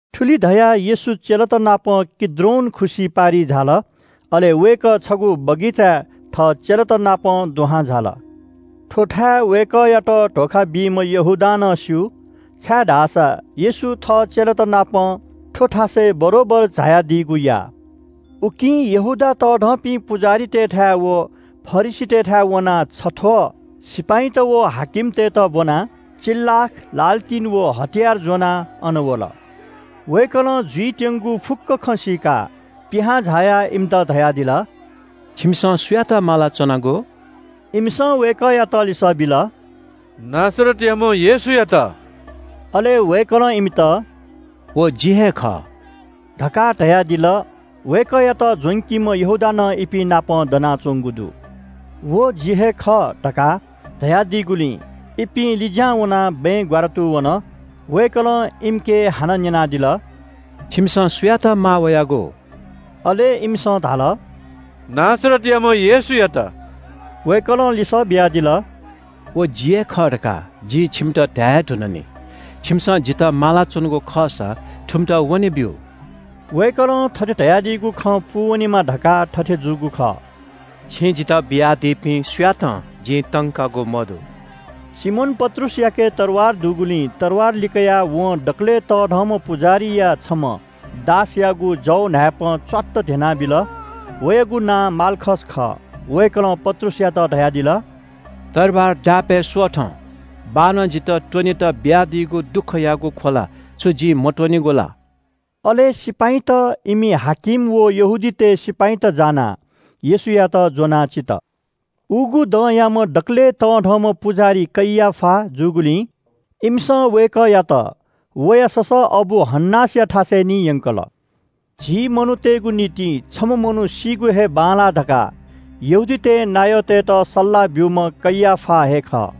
थुलि धयाः येशू चेलात नाप किद्रोन खुसि पारिइ झाल। अले वय्‌कः छगू बगैँचाय् थः चेलातनापं दुहां झाल। थ्‍व थाय् वय्‌कःयात धोखा बीम्‍ह यहूदां नं स्‍यू, छाय्‌धाःसा येशू थः चेलातनापं थ्‍व थासय् बरोबर झायादीगु याः। उकिं यहूदा तःधंपिं पुजाहारीतय्‌थाय् व फरिसीतय्‌थाय् वनाः छथ्‍वः सिपाइँत व हाकिमतय्‌त ब्‍वनाः मिप्‍वाः, लालतिन, व हतियार ज्‍वनाः अन वल। वय्‌कलं जुइत्‍यंगु फुक्‍क खँ सीकाः पिहां झायाः इमित धयादिल – “छिमिसं सुयात माला च्‍वनागु?” इमिसं वय्‌कःयात लिसः बिल – “नासरतयाम्‍ह येशूयात।” अले वय्‌कलं इमित – “व जि हे खः” धकाः धयादिल। वय्‌कःयात ज्‍वंकीम्‍ह यहूदा नं इपिं नाप दनाच्‍वंगु दु। “व जि हे खः” धकाः धयादीगुलिं इपिं लिज्‍यां वनाः बँय् ग्‍वारातू वन। वय्‌कलं इमिके हानं न्‍यनादिल – “छिमिसं सुयात माः वयागु?” अले इमिसं धाल – “नासरतयाम्‍ह येशूयात।” वय्‌कलं लिसः बियादिल – “व जि हे खः धकाः जिं छिमित धाये हे धुन नि। छिमिसं जितः माला च्‍वनागु खःसा थुमित वनेब्‍यु।” वय्‌कलं थथे धयादीगु खँ पूवनेमा धकाः थथे जूगु खः – “छिं जितः बियादीपिं सुयातं जिं तंकागु मदु।” सिमोन पत्रुसयाके तरवार दुगुलिं तरवार लिकयाः वं दकलय् तःधंम्‍ह पुजाहारीया छम्‍ह दासयागु जव न्‍हाय्‌पं च्‍वात्त ध्‍यनाबिल। वयागु नां माल्‍खस खः। वय्‌कलं पत्रुसयात धयादिल – “तरवार दापय् स्‍वथँ। बाःनं जितः त्‍वनेत बियादीगु दुःखयागु ख्‍वला छु जिं मत्‍वनेगु ला?” अले सिपाइँत, इमि हाकिम व यहूदीतय् सिपाइँत जानाः येशूयात ज्‍वनाः चित। उगु दँयाम्‍ह दकलय् तःधंम्‍ह पुजाहारी कैयाफा जूगुलिं इमिसं वय्‌कःयात वया ससःअबु हन्‍नासया थाय् निं यंकल। झी मनूतय्‌गु निंतिं छम्‍ह मनू सीगु हे बांलाः धकाः यहूदीतय् नायःतय्‌त सल्‍लाह ब्‍यूम्‍ह कैयाफा हे खः।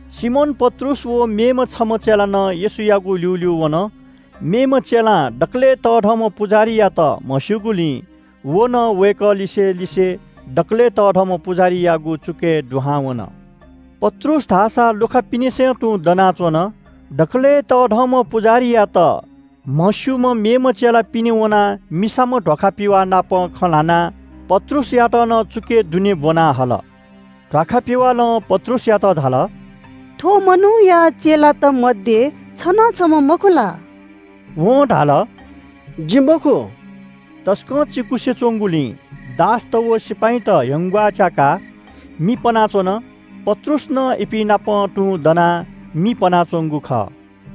सिमोन पत्रुस व मेम्‍ह छम्‍ह चेला नं येशूयागु ल्‍यूल्‍यू वन। मेम्‍ह चेलां दकलय् तःधंम्‍ह पुजाहारीयात म्‍हस्‍यूगुलिं व नं वय्‌कः लिसे लिसे दकलय् तःधंम्‍ह पुजाहारीयागु चुकय् दुहां वन। पत्रुस धाःसा लुखा पिनेसं तुं दनाच्‍वन। दकलय् तःधंम्‍ह पुजाहारीयात म्‍हस्‍यूम्‍ह मेम्‍ह चेला पिने वनाः मिसाम्‍ह ध्‍वाखा पिवाः नाप खँ ल्‍हानाः पत्रुसयात नं चुकय् दुने ब्‍वना हल। मिसाम्‍ह ध्‍वाखा पिवालं पत्रुसयात धाल – “थ्‍व मनूया चेलात मध्‍ये छ नं छम्‍ह मखु ला?” वं धाल “जि मखु।” तसकं चिकुसे च्‍वंगुलिं दासत व सिपाइँत ह्यंग्‍वाः च्‍याकाः मि पनाच्‍वन। पत्रुस नं इपिं नाप तुं दनाः मि पनाच्‍वंगु खः।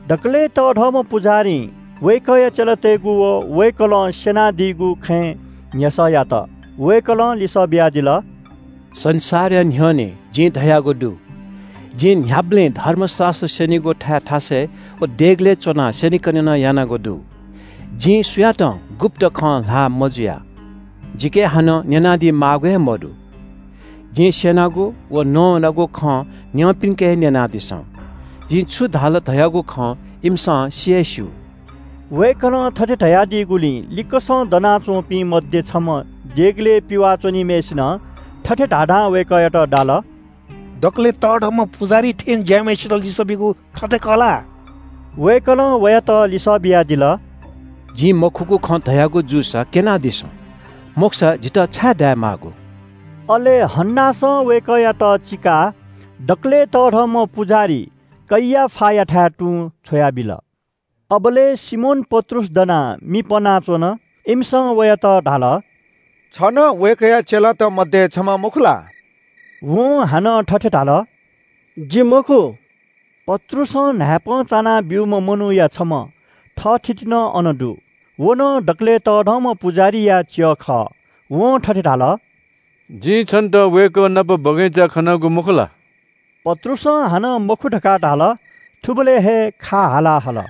दकलय् तःधंम्‍ह पुजाहारीं वय्‌कःया चेलातय्‌गु व वय्‌कलं स्‍यनादीगु खँय् न्‍ह्यसः यात। वय्‌कलं लिसः बियादिल – “संसारया न्‍ह्यःने जिं धयागु दु, जिं न्‍ह्याबलें धर्मशास्‍त्र स्‍यनीगु थाय् थासय् व देगलय् च्‍वनाः स्‍यनेकने यानागु दु। जिं सुयातं गुप्‍त खँ ल्‍हाः मजुया। जिके हानं न्‍यनादी माःगु हे मदु। जिं स्‍यनागु व नवानागु खँ न्‍यंपिन्‍के न्‍यनादिसँ। जिं छु धाल धयागु खँ इमिसं सि हे स्‍यू।” वय्‌कलं थथे धयादीगुलिं लिक्‍कसं दनाच्‍वंपिं मध्‍ये छम्‍ह देगलय् पिवाः च्‍वनीम्‍हय्‌सिनं थथे धाधां वय्‌कःयात दाल – “दकलय् तःधंम्‍ह पुजाहारी थें ज्‍याःम्‍हय्‌सित लिसः बीगु थथे खः ला?” वय्‌कलं वयात लिसः बियादिल – “जिं मखुगु खँ धयागु जूसा क्‍यनादिसँ। मखुसा जितः छाय् दाये माःगु?” अले हन्‍नासं वय्‌कःयात चीकाः दकलय् तःधंम्‍ह पुजाहारी कैयाफायाथाय् तुं छ्वयाबिल। अबलय् सिमोन पत्रुस दनाः मि पनाच्‍वन। इमिसं वयात धाल – “छ नं वय्‌कःया चेलात मध्‍ये छम्‍ह मखु ला?” वं हानं थथे धाल – “जि मखु।” पत्रुसं न्‍हाय्‌पं चाना ब्‍यूम्‍ह मनूया छम्‍ह थःथिति नं अन दु। व नं दकलय् तःधंम्‍ह पुजाहारीया च्‍यः खः। वं थथे धाल – “जिं छन्‍त वय्‌कः नाप बगैँचाय् खनागु मखु ला?” पत्रुसं हानं “मखु” धकाः धाल। थुबलय् हे खा हाला हल।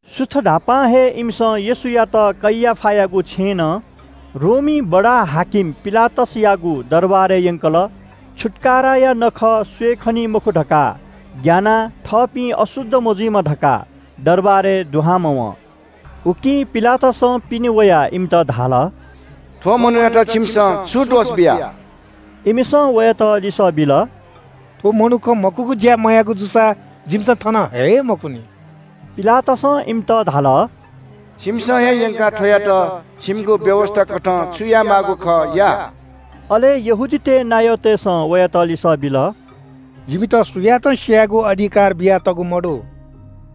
सुथ न्‍हापां हे इमिसं येशूयात कैयाफायागु छेँनं रोमी बडा-हाकिम पिलातसयागु दरबारय् यंकल। छुत्‍काराया नखः स्‍वये खनी मखु धकाः ग्‍यानाः थःपिं अशुद्ध मजुइमा धकाः दरबारय् दुहां मवं। उकिं पिलातसं पिने वयाः इमित धाल – “थ्‍व मनूयात छिमिसं छु दोष बिया?” इमिसं वयात लिसः बिल – “थ्‍व मनुखं मखुगु ज्‍या मयाःगु जूसा जिमिसं थन हये हे मखुनि।” पिलातसं इमित धाल – “छिमिसं हे यंकाः थ्‍वयात छिमिगु व्‍यवस्‍थाकथं छु यायेमाःगु खः, या।” अले यहूदीतय् नायःतय्‌सं वयात लिसः बिल – “जिमित सुयातं स्‍यायेगु अधिकार बियातःगु मदु।”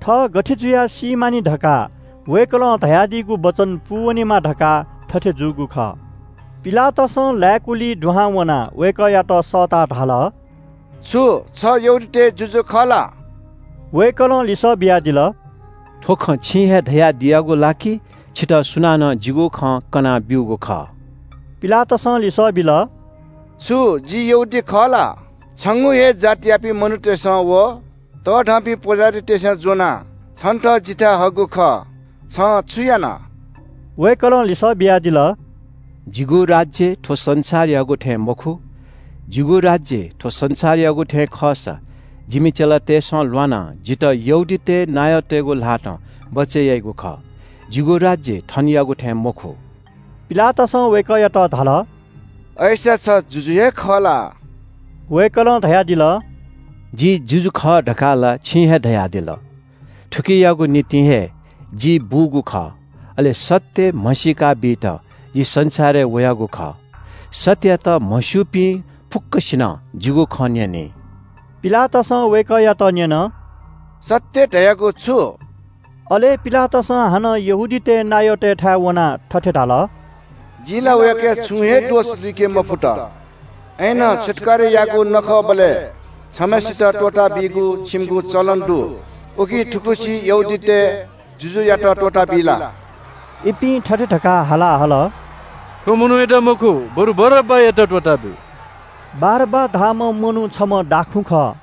थः गथे जुयाः सी मानि धकाः वय्‌कलं धयादीगु वचन पूवनेमा धकाः थथे जूगु खः। पिलातसं लाय्‌कुलिइ दुहां वनाः वय्‌कःयात सःताः धाल – “छु छ यहूदीतय् जुजु खः ला?” वय्‌कलं लिसः बियादिल – “थ्‍व खँ छिं हे धयादियागु ला कि छितः सुनानं जिगु खँ कना ब्‍यूगु खः?” पिलातसं लिसः बिल – “छु जि यहूदी खः ला? छंगु हे जातयापिं मनूतय्‌सं व तःधंपिं पुजाहारीतय्‌सं ज्‍वनाः छन्‍त जिथाय् हःगु खः। छं छु याना?” वय्‌कलं लिसः बियादिल – “जिगु राज्‍य थ्‍व संसारयागु थें मखु। जिगु राज्‍य थ्‍व संसारयागु थें खःसा जिमि चेलातय्‌सं ल्‍वानाः जितः यहूदीतय् नायःतय्‌गु ल्‍हातं बचय् याइगु खः। जिगु राज्‍य थनयागु थें मखु।” पिलातसं वय्‌कःयात धाल – “अय्‌सा छ जुजु हे खः ला?” वय्‌कलं धयादिल – “जि जुजु खः धकाः ला छिं हे धयादिल। थुकियागु निंतिं हे जि बूगु खः, अले सत्‍य म्‍हसीका बीत जि संसारय् वयागु खः। सत्‍ययात म्‍हस्‍यूपिं फुक्‍कसिनं जिगु खँ न्‍यनी।” पिलातसं वय्‌कःयात न्‍यन – “सत्‍य धयागु छु?” अले पिलातसं हानं यहूदीतय् नायःतय्‌थाय् वनाः थथे धाल – “जिं ला वयाके छुं हे दोष लुइके मफुत। अय्‌नं छुत्‍काराया नखःबलय् छम्‍हय्‌सित त्‍वःताबीगु छिमिगु चलन दु, उकिं थुगुसी यहूदीतय् जुजुयात त्‍वःताबी ला?” इपिं थथे धकाः हाला हल “थ्‍व मनूयात मखु, बरु बारब्‍बायात त्‍वःताब्‍यु।” बारब्‍बा धाःम्‍ह मनू छम्‍ह दाखुँ खः।